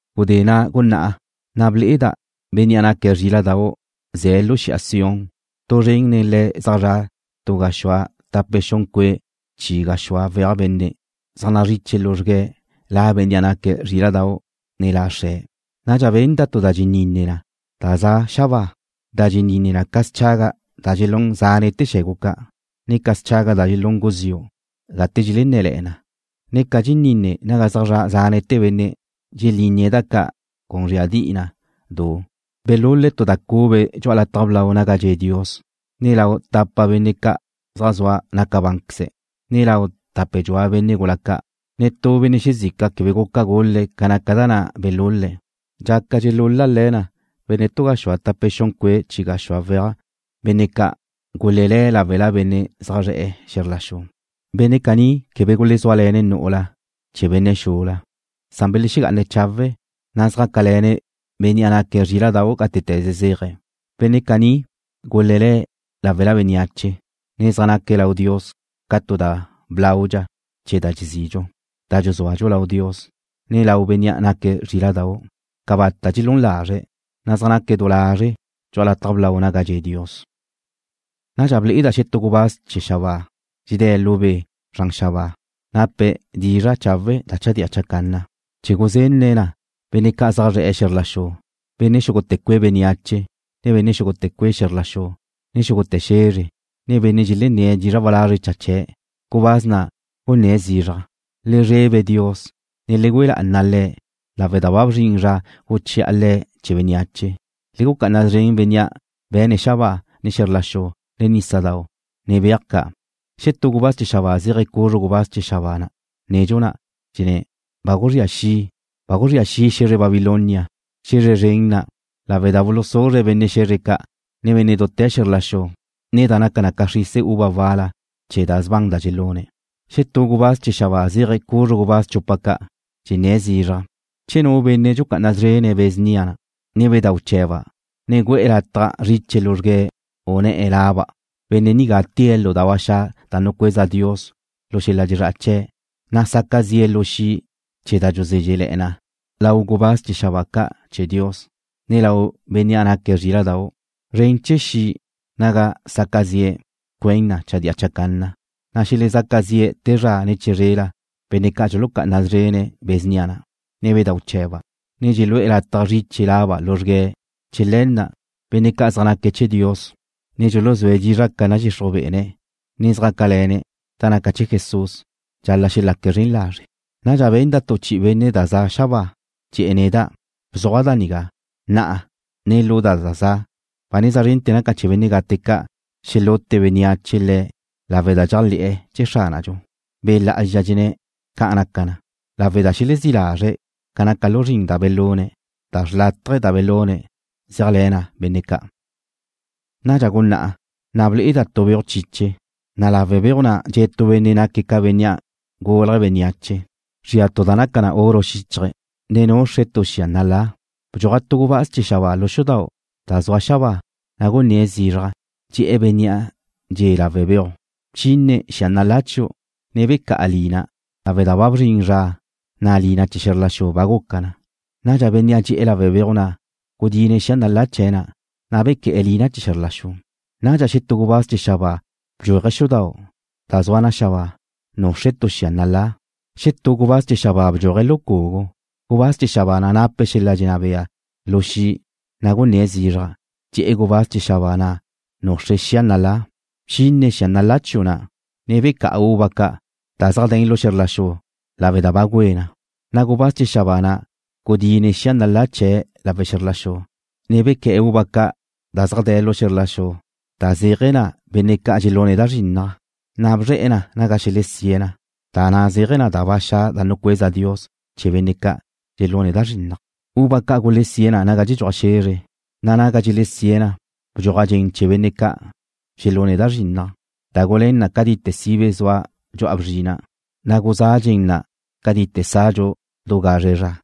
Gudé na' gunná'a, na' ble'eda' Bénnea' naque̱' Zríla'dau' ze̱' lu xi'a Sión. Tu zren nen Le̱' zaj zra' tu gaxúa tape xun cue' chi gaxúa weaj benne', zaj zriche luzrgue̱' La Bénnea' naque̱' Zríla'dau', ne La Xre̱'. Nadxa benda' tu da dxeninne na da za' xabáa, da dxeninne na ca schaga' da dxelún zánete̱ xe̱gu ca', ne ca schaga' da dxun guziu' gate dxenné̱le̱'e̱ na, ne ca dxeninne naga zaj zra' zánete̱ benne' dxelínnie̱' da ca' cun zríadi'i na du. Belul-le̱' tu da cube dxu'a lataj blau naga dxe' Dios, ne lau tapa benne' ca' zaj zua nabancze', ne lau tape dxua benne' gula ca'. Netú benne' xezica quebe guca gul-le̱' ca naca da na' belul-le̱'. Dxaca dxelul-le na benne' tu gaxúa tape xun cue' chi gaxúa weaj, benne' ca' gulelé̱' láwela benne' zaj zre̱'e̱ xe̱zr la xu. Benne' caní quebe gulezúale̱ne̱' nu'ula chee̱ benne' xula, san belexegá'ana chawe̱', na' zjácale̱ne̱' Bénnea' naque̱' Zríla'dau' gátete̱ze zéaje̱'. Benne' caní gulelé̱' láwela bénneache, ne zaj naque̱' lau Dios ca tu da blaudxa chee̱ da dxezidxu, da dxuzúadxu lau Dios, ne lau Bénnea' naque̱' Zríla'dau'. Cabata' dxelún lazre̱', na' zaj naque̱' du lazre' dxu'a lataj blau naga dxe' Dios. Nadxa ble'eda' xetú gubáz chee̱ xabáa dxedé̱' lu be' zran xabáa, nape̱' dizra' chawe' da chadía chacanna, chee̱ guzenne̱' na benne' ca' zaj zre̱'e̱ xe̱zr la xu, benne' xúgute̱ cue' bénneache, ne benne' xúgute̱ cue' xe̱zr la xu, ne xúgute̱ xe̱zre, ne benne' dxelenné̱' dizra' walazre' cha chee̱'. Gubáz na' gunné̱' zizraj: ―Le zrebe Dios, ne le güe lá'ana Le̱' lawe' da ba bzrin zra guchi'a Le̱' chee̱ bénneache. Le gucá'ana szren Bénnea' be̱ne̱' xabáa, ne xe̱zr la xu, ne nísadau', ne beaj ca'. Xetú gubáz chee̱ xabáa zéaje̱' cuzru gubáz chee̱ xabáa nedxu na', dxenné̱': ―¡Ba guzría xi'! ¡Ba guzría xi' xe̱zre Babilonia, xe̱zre zren na', lawe' da bulusuzre' benne' xe̱zre ca', ne benne' dute̱ xe̱zr la xu nen da naca ca xrise uva wal-la chee̱ da sban da dxelune̱'! Xetú gubáz chee̱ xabáa zéaje̱' cuzru gubáz chupa ca', dxenné̱' zizraj: ―¡Che nu benne' dxucá'ana szrene̱' be̱ snia na', ne bedau' chee̱ba', ne gu'e̱ lataj zriche luzrgue̱' u ne̱'e̱ laba', benne' nigá tée̱' lu da ba xa' da nucueza Dios lu xel-la' dxezrá'a chee̱', na' saca zi'e̱ lu xi' chee̱ da dxuzézxele̱'e̱ na lau gubáz chee̱ xabáa ca' chee̱ Dios, ne lau Bénnea' naque̱' Zríla'dau'! ¡Zren chee̱ xi', naga saca zi'e̱, cuen na chadía chacanna, na' xelezaca zi' te zra ne chizrela benne' ca' dxulucá'ana szrene̱' be̱ snia na', ne bedau' chee̱ba', ne dxelu'e̱ lataj zriche laba' luzrgue̱'! ¡Chee̱ le̱ na', benne' ca' zaj naque̱' chee̱ Dios, ne dxuluzúe̱' dizra' ca nadxixruj be'ene̱', ne zjácale̱ne̱' da naca chee̱ Jesús, dxal-la' xelaque̱' zren lazre'! Nadxa benda' chi'i tu benne' da za xabáa. Dxe̱'e̱ neda': ―Bzuaj da nigá: Na'a, ne lu da za za' ba neza zrente̱ naca na chee̱ benne' gate ca' xelute bénneache le̱' lawe' da dxeléajle̱'e̱ chee̱ Xránadxu. Be' Lá'azxa dxenné̱': “¡Ca' naca na, lawe' da xelexezí' lazre̱' ca naca lu zrin da belune̱', na' da xrlátaje da belune̱' zeajle̱ na benne' ca'!” Nadxa guná'a, na' ble'eda' tu beuj chiche, na' lawe' beuj na' dxe' tu benne' naque̱' ca Bénnea' gulje̱' bénneache. Zria tu da naca na oro xíchaje̱', ne nuxre̱' tu xia nalá. Bdxuaj tu gubáz chee̱ xabáa lu xudau' da zua xabáa, na' gunné̱' zizraj. Dxe̱'e̱ bénnea' dxe'e̱ lawe' beuj: ―¡Bchine xia nalá chiu', ne becá'a lina, lawe' da ba bzrin zra, na' lina chee̱ xe̱zr la xu ba guca na! Nadxa bénnea' dxe'e̱ lawe' beuj na' gudine̱' xia nalá chee̱' na', na' bequé̱'e̱ lina chee̱ xe̱zr la xu. Nadxa xetú gubáz chee̱ xabáa bdxuaje̱' xudau' da zua xabáa, nuxre̱' tu xia nalá. Xetú gubáz chee̱ xabáa bdxuaje̱' lu cugu, gubáz chee̱ xabáa na' nape̱' xel-la' dxenná bea lu xi', na' gunné̱' zizraj. Dxe̱'e̱ gubáz chee̱ xabáa na' nuxre̱' xia nalá: ―¡Bchine xia nalá chiu' na', ne becá'a uva ca' da zaj de̱n lu xe̱zr la xu lawe' da ba güé na! Na' gubáz chee̱ xabáa na' gudine̱' xia nalá chee̱' lawe' xe̱zr la xu, ne bequé̱'e̱ uva ca' da zaj de̱ lu xe̱zr la xu da zéaje̱ na benne' ca' dxelune̱' da zrinnaj, na' bzre̱'e̱ na naga xelesíe̱' na, da na' zéaje̱ na da ba xa' da nucueza Dios chee̱ benne' ca' dxelune̱' da zrinnaj. Uva ca' gulesíe̱' na naga dxedxuaj xe̱zre, na' naga dxelesíe̱' na bdxuaj dxen chee̱ benne' ca' dxelune̱' da zrinnaj da gulén na cátite sibe zua dxu'a bzrina', na' guzá' dxen na' cátite sadxu du gazre zra.